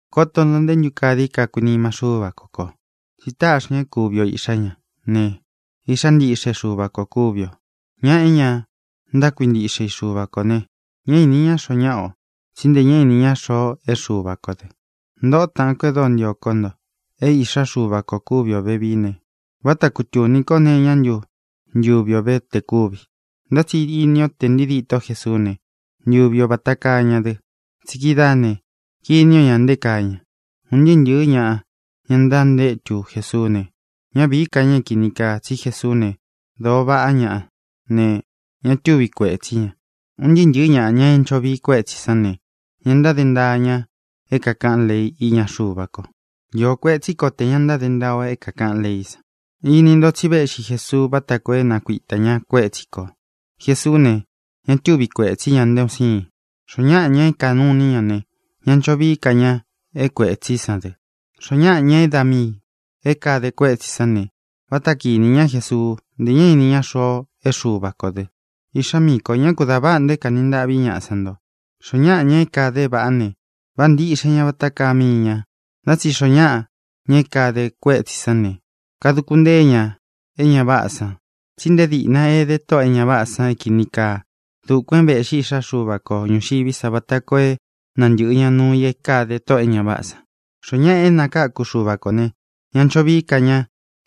Koto nto nté ntu kaa dii kakuinima Xúva ko kō, tsi táꞌxi ña é kuvi o iꞌxā ñá ne, iꞌxá ntiꞌxe Xuva kō kúvi ō. Ña é ña ntákuintiꞌxe i Xuva kō ne, ñá īni ñá xoo ñáꞌa o, tsí nte ñá īni ña xoo é Xuva kō dɨ. Ntōꞌo táꞌān kó e dóo ntio kó nto, é īꞌxá Xuva kō kúvi o vevií ne, váta kutūni kó nee iñá ntu ntuvi o ve tē kúvi, ntá tsi ini o tsí te ntīi díto Jesuú ne, ntuvi o vata kaa ña dɨ. Tsí kidáā ne, kini o ña nté kaa ña. Un ntɨɨ́ ntɨ̄ɨ́ ñaꞌa, ña ntantétu Jesuú ne, ñá vīí ka ña é kīni kaa, tsí Jesuú ne, dōo vaꞌá ña ne, ña túvi kuētsí ña. Un ntɨɨ́ ntɨ̄ɨ́ ñaꞌa, ña é ncho vii kuetsi sán ne, ña ntáde ntaa ña é kākaꞌán lei iña Xuva ko. Iō kuetsí ko tē ña ntáde ntaa o é kākaꞌán leí san. Ini ntó tsi véꞌxi Jesuú vata koo é nakuitā ña kuétsi kō. Jesuú ne, ña túvi kuētsí ña nté un siin. Xoó ñaꞌa, ña é kanuu iní i ña ne, ña ncho vií ka ña é kuētsí san dɨ. Xoó ñaꞌa, ña é da miī é kāde kuétsī sán ne, váta kinī ñá Jesuu. Ntē ñá īni ña xoo é Xuva kō dɨ. Iꞌxá miī ko, ñá kū da váꞌa nto é kāni ntaꞌví ñaꞌa san nto. Xoó ñaꞌa, ña é kāde é vāꞌá ne, váꞌā ntiꞌxe ña vata kaá mii ñā. Ntá tsi xoo ñáꞌa, ña é kāde kuétsī sán ne, kaduku ntée ña e ña váꞌā san. Tsí nte díꞌna ede tóꞌō e ña váꞌā san é kīni kaa. Dukuān é vēꞌxí Iꞌxá Xuva ko ñūxiví sa vata koo é nantɨ̄ꞌɨ ña nuu i é kāde tóꞌō e ña váꞌā san. Xoó ñaꞌa é nakáku Xuva kō ne, ñá ncho vií ka ña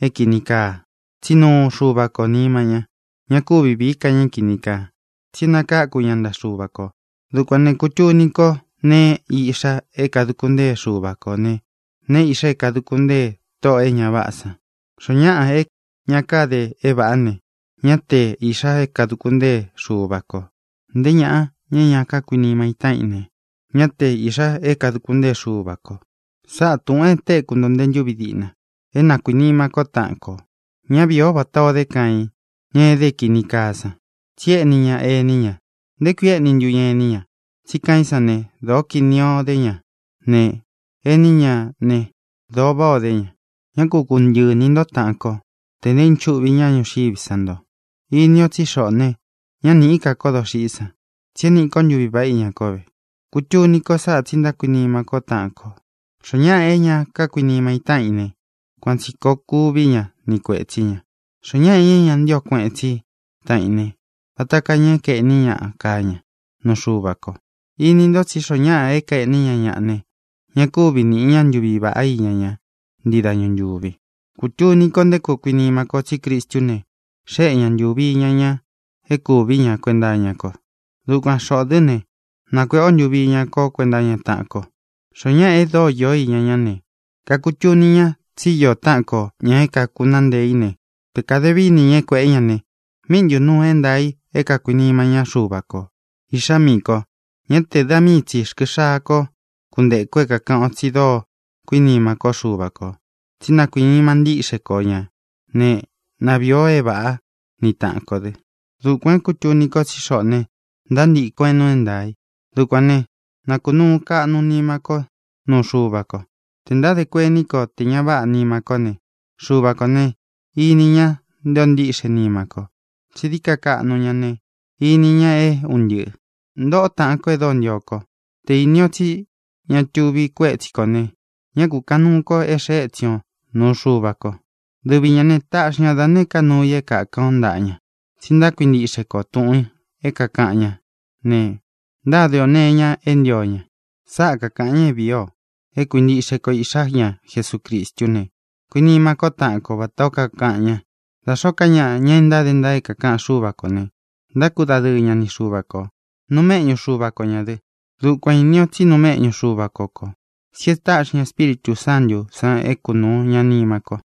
é kīni kaa, tsí nuu Xuva kō nima ña. Ña kúvi vīí ka ña é kīni kaa, tsi é nakáku ña ntaꞌa Xuva kō. Dukuān ne, kutuni ko neé iꞌxa é kāduku ntée Xuva kō ne, neé iꞌxa é kāduku ntée tóꞌō e ña váꞌā san. Xoó ñaꞌa é ña káde é vāꞌá ne, ñá te īꞌxa é kāduku ntée Xuva kō. Nté ñaꞌa, ña é ña kákuinima í taꞌan i ne, ñá te īꞌxa é kāduku ntée Xuva kō. Sáꞌa tūꞌun e téku nto nte ntúvi díꞌna: é na kuīnima kó taꞌan kō. Ñá vīi o vata o dé Caiin, ña é ede é kīni kaa san, tsí éꞌni ña ení ña. ¿Nté kui éꞌni ntu ña ení ña? Tsí Caiín san ne, dōó kīni o dé ña ne, ení ña ne, dōo váꞌā o dé ña. Ñá ku kuntɨꞌɨ ini nto, tāꞌan kó, tē ntaínchuꞌvi ñaꞌa ñuxiví sa nto. Ini o tsí xoꞌō ne, ñá nīꞌí ka ko doxiꞌí san tsi e níꞌi ko ntuvi vāꞌá iña kó ve. Kutuni ko sáꞌā, tsí ntákuinima kó taꞌan kō. Xoó ñaꞌa é ña kákuinima í taꞌan i ne, kuan tsī koo kuví ña ni kuētsí ña. Xoó ñaꞌa, ña é ña ntío kueꞌen tsí i taꞌan í ne, vata kaa ña é kaēꞌní ñaꞌa kaa ña nuu Xuva ko. Ini nto tsí xoo ñáꞌa é kaēꞌní ña ñaꞌa ne, ña kúvi nīꞌi ñá ntuvi vaꞌá iña ña ntii dañu ntúvi. Kutuni ko nté koo kuinima ko, tsí Cristú ne, xéꞌe ña ntuvi iña ña é kuvī ñá kuenta iña ko. Dukuan xoꞌō dɨ́ ne, nakuēꞌe ó ntuvi iña ko kuenta iña taꞌan ko. Xoó ñaꞌa e dóo iō iña ñá ne, kakutuni ña tsí īó taꞌan kō, ña é kakunaá ntee í ne, te kāde vií ini ña é kuēꞌé ña ne, ¿míꞌi ntū nuu é ntaā i é kākuinima ñá Xuva kō? Iꞌxá miī ko, ñá te da mii tsī rkɨ xaa ko kunteku é kākaꞌan o tsi dóo kuinima kó Xuva kō, tsí na kuīnima ntíꞌxe ko ñā né, na vīi o é vāꞌá ni taꞌan kō dɨ. Dukuān é kūtuni ko tsí xoꞌō ne, ntántīkɨn o é nuu é ntaā i. Dukuān ne, nakunuú kaꞌnu nima kó nuu Xuva ko. Tē ntáde kuení ko té ña váꞌa nima kó ne, Xuva kō ne, ini ña nté ō ntíꞌxe nima ko, tsi dií ka kaꞌnu ña ne, ini ña é un ntɨꞌɨ̄. Ntōꞌó taꞌan kó e dóo ntio kó, te inī o tsí ña tuvi kuétsi kō ne, ñá kūkaꞌan nuu ko é xēe étsin o nūu Xuva ko. Dɨvi ñā ne, taꞌxi ña da nēé ka nuu i é kākan o ntaꞌa ña, tsi ntákuintiꞌxe ko tūꞌun é kākaꞌan ñá ne, ntáde ō nee iña e ntío ña. Sáꞌa kākaꞌan ña é vīi o: é kuintiꞌxe ko Iꞌxā ñá Jesucristú ne, kuinima ko taꞌan ko, vatā ó kakaꞌan ña. Da xōó ka ñaꞌa, ña é ntáde ntaa é kākaꞌan Xúva kō ne, ntákudadɨɨ ña ni Xuva kō. Nuu méꞌñu Xuva ko ñā dɨ. Dukuān íni o tsí nuu méꞌñu Xuva ko kō, tsí e táꞌxi ña Espíritū Sántū san é kunūu ña nima ko.